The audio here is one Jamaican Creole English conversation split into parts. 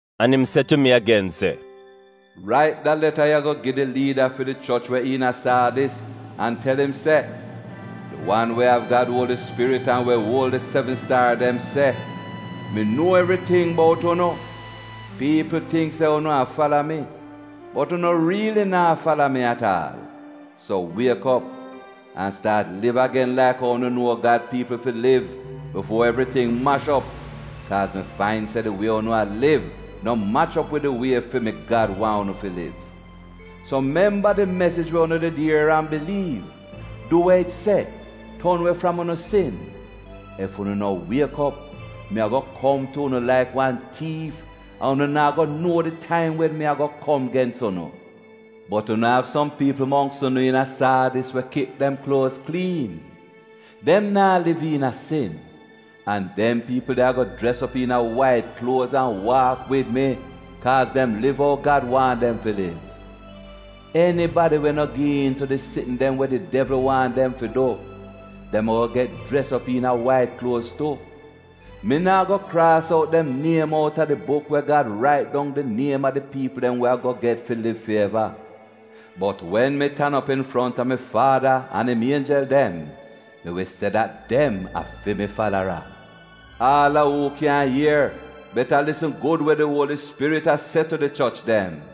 An im se tu mi agen, “Rait da leta ya go gi di liida fi di choch we iina Saadis an tel im se: Di wan we av Gad Uoli Spirit an we uol di sevn staar dem se, mi nuo evriting bout unu. Piipl tingk se unu a fala mi, bot unu riili naa fala mi at aal. So wiek op, an staat liv agen laik ou unu nuo Gad piipl fi liv, bifuo evriting mash op, kaaz mi fain se di wie unu a liv no mach op wid di wie fi mi Gad waahn unu fi liv. So memba di mesij we unu did ier an biliiv; du we it se, ton we fram unu sin. Ef unu no wiek op, mi ago kom tu unu laik wan tiif, an unu naa go nuo di taim wen mi ago kom gens unu. Bot unu av som piipl mongks unu iina Saadis we kip dem kluoz kliin — dem naa liv iina sin. An dem piipl de ago jres op iina wait kluoz an waak wid mi kaaz dem liv ou Gad waahn dem fi liv. Enibadi we no gi iin tu di sitn dem we di devl waahn dem fi du, dem ago get jres op iina wait kluoz tu. Mi naa go kraas out dem niem outa di buk we Gad rait dong di niem a di piipl dem we ago get fi liv fi eva, bot wen mi tan op infronta mi Faada an im ienjel dem, mi wi se dat dem a fi mi falara. Aal a uu kyan ier beta lisn gud we di Uoli Spirit a se tu di choch dem.”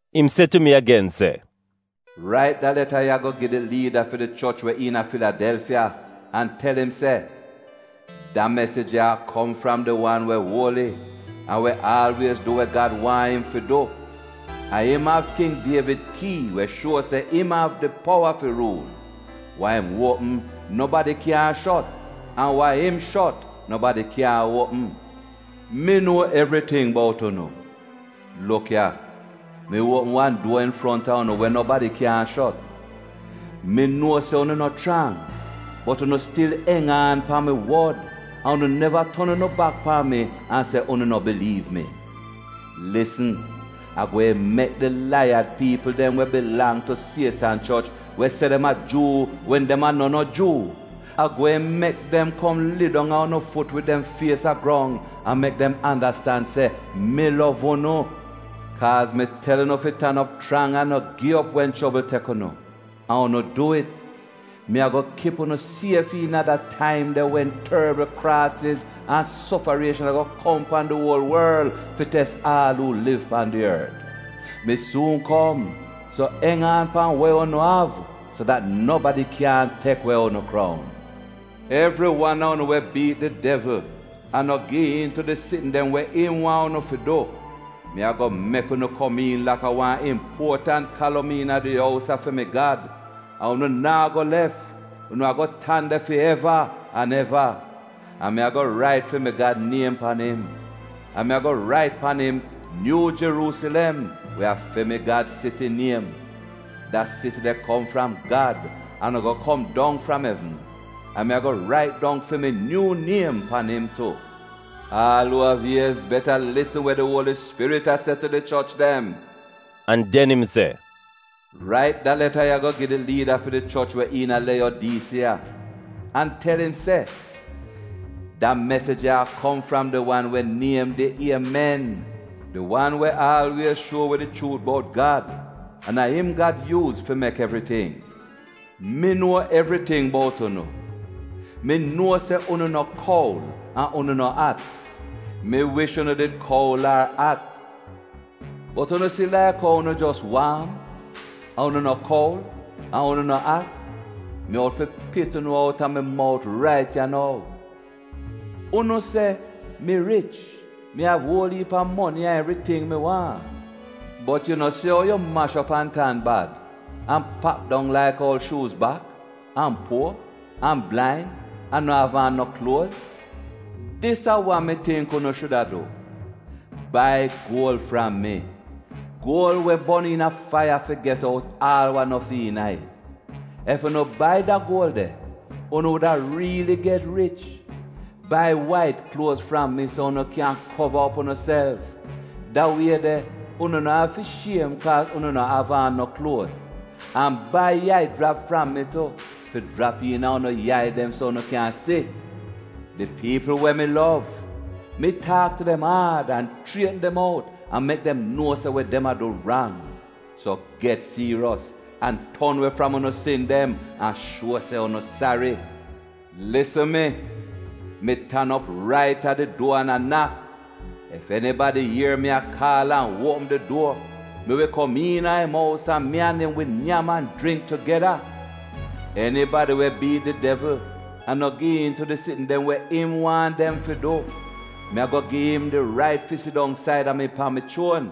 Im se tu mi agen, “Rait da leta ya go gi di liida fi di choch we iina Filidelfiya an tel im se: Da mesij ya a kom fram di wan we uoli an we aalwiez du we Gad waahn im fi du. A im av King Dievid kii we shuo se im av di powa fi ruul. Wa im uopm nobadi kyaahn shot, an wa im shot nobadi kyaahn uopm. Mi nuo evriting bout unu. (Luk ya, mi uopm wan duor infronta unu we nobadi kyaahn shot). Mi nuo se unu no chrang, bot unu stil eng aan pan mi wod an unu neva ton unu bak pan mi an se unu no biliiv mi. Lisn! A gweehn mek di laiyad piipl dem we bilang tu Sietan choch, we se dem a Juu wen dem a no no Juu — a gweehn mek dem kom lidong a unu fut wid dem fies a grong an mek dem andastan se mi lov unu. Kaaz mi tel unu fi tan op chrang an no gi op wen chobl tek unu, an unu dwi'it, mi ago kip unu sief iina da taim de wen torbl kraasiz an sofarieshan ago kom pan di uol worl fi tes aal uu liv pan di ort. Mi suun kom so eng aan pan we unu av so dat nobadi kyaahn tek we unu kroun. Evri wan a unu we biit di devl an no gi iin tu di sitn dem we im waahn unu fi du, mi ago mek unu bi laik wan impuotant kalom iina fi mi Gad ous, an unu naa go lef, unu ago tan de fi eva an eva. An mi ago rait fi mi Gad niem pan im, an mi ago rait pan im Nyuu Jeruusilem, we a fi mi Gad siti niem. Da siti de kom fram Gad an ago kom dong fram evn. An mi ago rait dong fi mi nyuu niem tu. Aal uu av iez beta lisn we di Uoli Spirit a se tu di choch dem.” An den im se, “Rait da leta ya go gi di liida fi di choch we iina a Leyodiisiya an tel im se: Da mesij ya a kom fram di wan we niem di Iemen, di wan we aalwiez shuo wi di chuut bout Gad, an a im Gad yuuz fi mek evriting. Mi nuo evriting bout unu. Mi nuo se unu no kuol an unu no at. Mi wish unu did iida kuol ar at Bot unu si laik ou unu jos waam — an unu no kuol an unu no at — mi out fi pit unu outa mi mout rait ya nou. Unu se, ‘Mi rich; mi av uol iip a moni an evriting mi waahn.’ Bot yu no si ou yu mash op an tan bad, an pap dong laik oul shuuz bak, an puor, an blain an na'av aan no kluoz? Dis a wa mi tingk unu shuda du, bai guol fram mi, guol we bon iina faiya fi get out aal wa no fi iina it. Ef unu bai da guol de, unu wuda riili get rich. Bai wait kluoz fram mi so unu kyan kova op unuself. Da wie de unu na'av fi shiem kaaz unu na'av aan no kluoz. An bai yai jrap fram mi tu fi jrap iina unu yai dem so unu kyan si. Di piipl we mi lov, mi taak tu dem aad an chrietn dem out an mek dem nuo se we dem a du rang. So get siiros an ton we fram unu sin dem an shuo se unu sari. Lisn mi! Mi tan op rait a di duor an a nak. Ef enibadi ier mi a kaal an uopm di duor, mi wi kom iina im ous an mi an im wi nyam an jringk tugeda. Enibadi we biit di devl an no gi iin tu di sitn dem we im waahn dem fi du, mi ago gi im di rait fi sidong saida mi, pan mi chuon,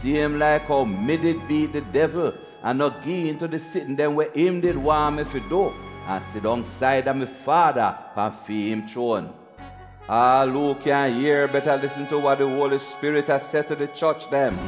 siem laik ou mi did biit di devl an no gi iin tu di sitn dem we im did waahn mi fi du, an sidong saida mi Faada pan fi'im chuon. Aal uu kyan ier beta lisn tu wa di Uoli Spirit a se tu di choch dem.”